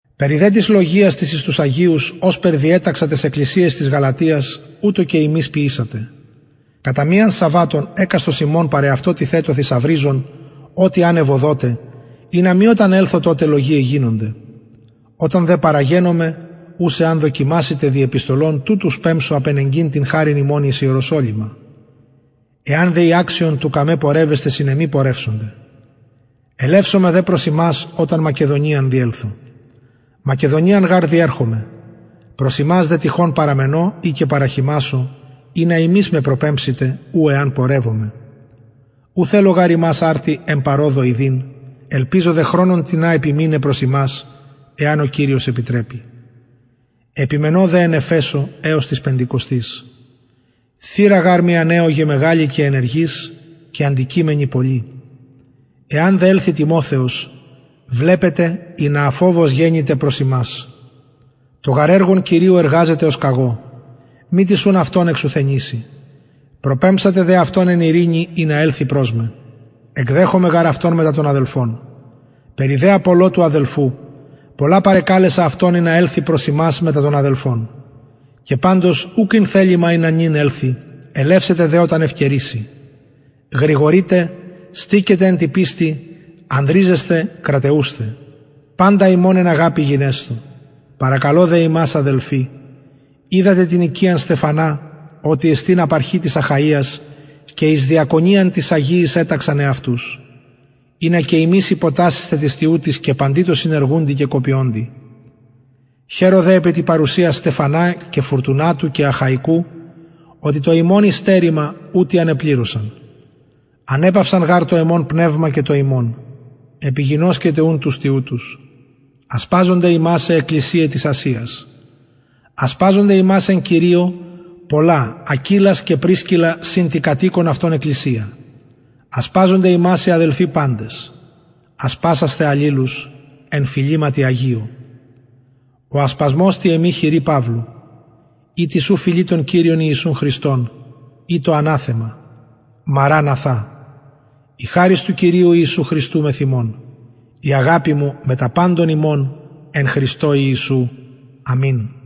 περι δε της λογιας της εις τους αγιους ωσπερ διεταξα ταις εκκλησιαις της γαλατιας ουτως και υμεις ποιησατε κατα μιαν σαββατων εκαστος υμων παρ εαυτω τιθετω θησαυριζων ο τι αν ευοδωται ινα μη οταν ελθω τοτε λογιαι γινωνται οταν δε παραγενωμαι ους εαν δοκιμασητε δι επιστολων τουτους πεμψω απενεγκειν την χαριν υμων εις ιερουσαλημ εαν δε η αξιον του καμε πορευεσθαι συν εμοι πορευσονται ελευσομαι δε προς υμας οταν μακεδονιαν διελθω μακεδονιαν γαρ διερχομαι προς υμας δε τυχον παραμενω η και παραχειμασω ινα υμεις με προπεμψητε ου εαν πορευωμαι ου θελω γαρ υμας αρτι εν παροδω ιδειν ελπιζω δε χρονον τινα επιμειναι προς υμας εαν ο κυριος επιτρεπη επιμενω δε εν εφεσω εως της πεντηκοστης θυρα γαρ μοι ανεωγεν μεγαλη και ενεργης και αντικειμενοι πολλοι εαν δε ελθη τιμοθεος βλεπετε ινα αφοβως γενηται προς υμας το γαρ εργον κυριου εργαζεται ως και εγω μη τις ουν αυτον εξουθενηση προπεμψατε δε αυτον εν ειρηνη ινα ελθη προς με εκδεχομαι γαρ αυτον μετα των αδελφων περι δε απολλω του αδελφου πολλα παρεκαλεσα αυτον ινα ελθη προς υμας μετα των αδελφων και παντως ουκ ην θελημα ινα νυν ελθη ελευσεται δε οταν ευκαιρηση γρηγορειτε στηκετε εν τη πιστει ανδριζεσθε κραταιουσθε παντα υμων εν αγαπη γινεσθω παρακαλω δε υμας αδελφοι οιδατε την οικιαν στεφανα οτι εστιν απαρχη της αχαιας και εις διακονιαν τοις αγιοις εταξαν εαυτους ινα και υμεις υποτασσησθε τοις τοιουτοις και παντι τω συνεργουντι και κοπιωντι χαιρω δε επι τη παρουσια στεφανα και φουρτουνατου και αχαικου οτι το υμων υστερημα ουτοι ανεπληρωσαν ανεπαυσαν γαρ το εμον πνευμα και το υμων επιγινωσκετε ουν τους τοιουτους ασπαζονται υμας αι εκκλησιαι της ασιας ασπαζονται υμας εν κυριω πολλα ακυλας και πρισκιλλα συν τη κατ οικον αυτων εκκλησια ασπαζονται υμας οι αδελφοι παντες ασπασασθε αλληλους εν φιληματι αγιω ο ασπασμος τη εμη χειρι παυλου ει τις ου φιλει τον κυριον ιησουν χριστον ητω αναθεμα μαραν αθα η χαρις του κυριου ιησου χριστου μεθ υμων η αγαπη μου μετα παντων υμων εν χριστω ιησου αμην